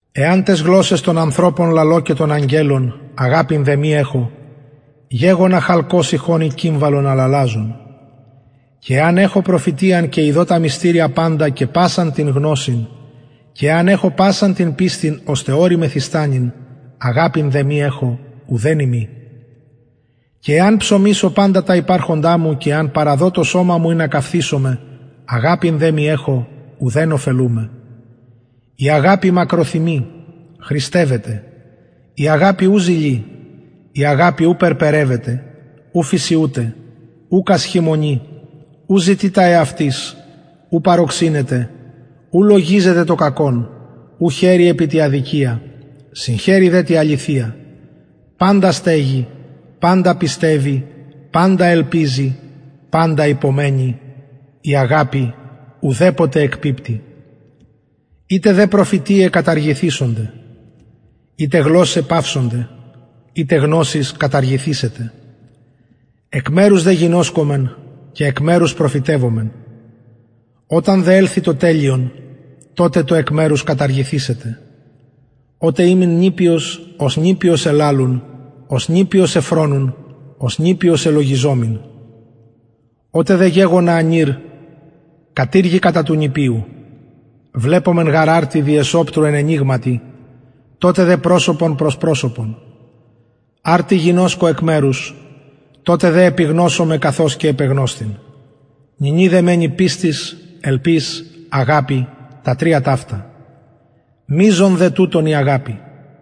εαν ταις γλωσσαις των ανθρωπων λαλω και των αγγελων αγαπην δε μη εχω γεγονα χαλκος ηχων η κυμβαλον αλαλαζον και εαν εχω προφητειαν και ειδω τα μυστηρια παντα και πασαν την γνωσιν και εαν εχω πασαν την πιστιν ωστε ορη μεθιστανειν αγαπην δε μη εχω ουθεν ειμι και εαν ψωμισω παντα τα υπαρχοντα μου και εαν παραδω το σωμα μου ινα καυθησωμαι αγαπην δε μη εχω ουδεν ωφελουμαι η αγαπη μακροθυμει χρηστευεται η αγαπη ου ζηλοι η αγαπη ου περπερευεται ου φυσιουται ουκ ασχημονει ου ζητει τα εαυτης ου παροξυνεται ου λογιζεται το κακον ου χαιρει επι τη αδικια συγχαιρει δε τη αληθεια παντα στεγει παντα πιστευει παντα ελπιζει παντα υπομενει η αγαπη ουδεποτε εκπιπτει ειτε δε προφητειαι καταργηθησονται ειτε γλωσσαι παυσονται ειτε γνωσις καταργηθησεται εκ μερους δε γινωσκομεν και εκ μερους προφητευομεν οταν δε ελθη το τελειον τοτε το εκ μερους καταργηθησεται οτε ημην νηπιος ως νηπιος ελαλουν ως νηπιος εφρονουν ως νηπιος ελογιζομην οτε δε γεγονα ανηρ κατηργηκα τα του νηπιου βλεπομεν γαρ αρτι δι εσοπτρου εν αινιγματι τοτε δε προσωπον προς προσωπον αρτι γινωσκω εκ μερους τοτε δε επιγνωσομαι καθως και επεγνωσθην νυνι δε μενει πιστις ελπις αγαπη τα τρια ταυτα μειζων δε τουτων η αγαπη